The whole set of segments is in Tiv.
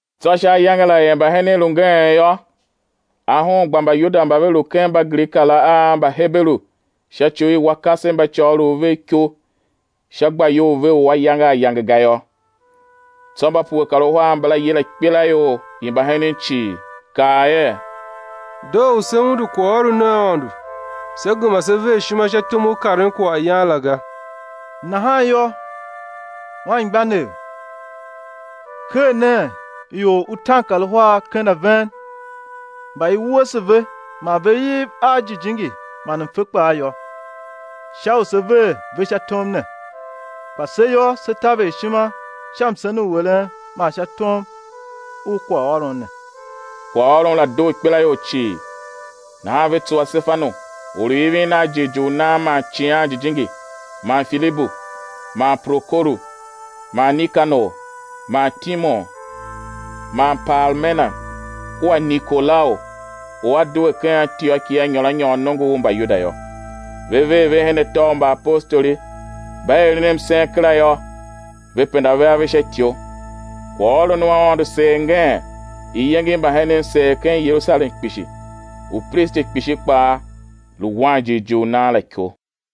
Tsô sha ayange la er mbahenen lu ngeen yô, ahon gba Mbayuda mba ve lu ken Mbagrika la a Mbaheberu sha ci u i wa kasev mba côgholov vev iko sha gbayol ve u ayange ayange ga yô. Tsô mba pue kar uhar mbala yila ikpelaior i mbahenen cii, kaa er: Doo u sé undu kwaghôron u Aôndo, sé gema sé ver ishima sha tom u karen kwaghyan la ga. Nahan yô, anmgbianev, ker nen ior utaankaruhar ken a ven, mba i wuese ve, man ve iv a Jijingi man mfe kpaa yô, sha u se̱ ver ve sha tom ne. Kpa se yô, sé taver ishima sha msen u eren man sha tom u kwaghôron ne. Kwaghôron la doo ikpelaior cii; nahan ve tsuwa Sefanu, or u ivin a jighjigh u nan man Icighan Jijingi, man Filibu man Prokoru man Nikanor man Timon man Parmena kua Nikolau u a due ken Antioki a nyôr a nyôr nongo u Mbayuda yô. Ve ver ve her atô u mbaapostoli; mba eren msen kera yô, ve penda ve ave sha ityo. Kwaghôron u Aôndo seer ngeen; iyenge i mbahenen seer ken Yerusalem kpishi; upristi kpishi kpaa lu wan jighjigh u nan la iko.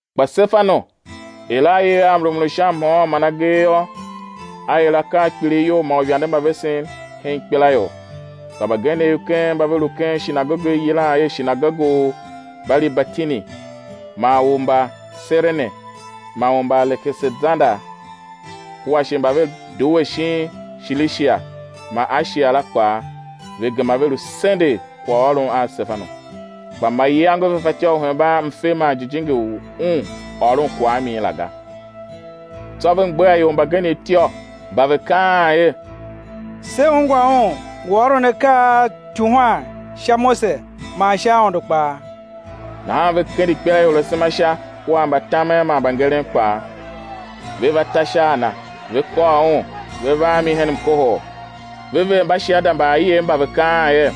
Kpa Sefanu, er a iv a mrumun u sha mhôôn man agee yô, a er akaa a kpilighyol man uivande mba vesen hen ikpelaior. Kpa mbagenev ken mba ve lu ken shinagoge u i yilan er shinagoge u Mbalibertini, man u Mbaserene man u Mbaalekesander kua shi mba ve due shin Shilishia man Ashia la kpaa, ve gema ve lu sendegh kwaghôron a Sefanu. Kpa mayange ve fatyô u hemban mfe man Jijingi u un ôron kwagh a min la ga. Tsô ve mgbegha ior mbagenev ityô mba ve kaan er: Se ungwa un ngu ôron akaa a uityuhwan sha Mose man sha Aôndo kpaa. Nahan ve kende ikpelaior asema sha kua mbatamen man mbangeren kpaa, ve va ta sha a na, ve kôr un, ve va a mi hen mkohol, ve ver mbashiada mba aiev mba ve kaan er: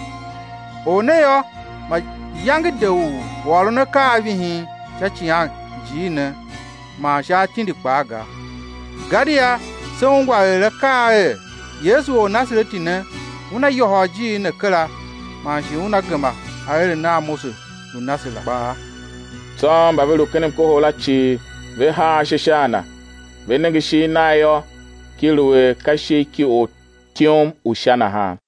Or ne yô, mayange de u ôron akaa a vihin sha icighanjiir ne man sha atindi kpaa ga. Gadia se ungwa er a kaa er: Yesu Ornasareti ne Una yôhôl ijiir ne kera man shi Una gema aeren a Mose lu na se la kpaa. Tsô mba ve lu ken mkohol la cii ve haa ashe sha a na, ve nenge ishigh nagh yô, ki lu er ka ishigh ki ortyom u Sha nahan.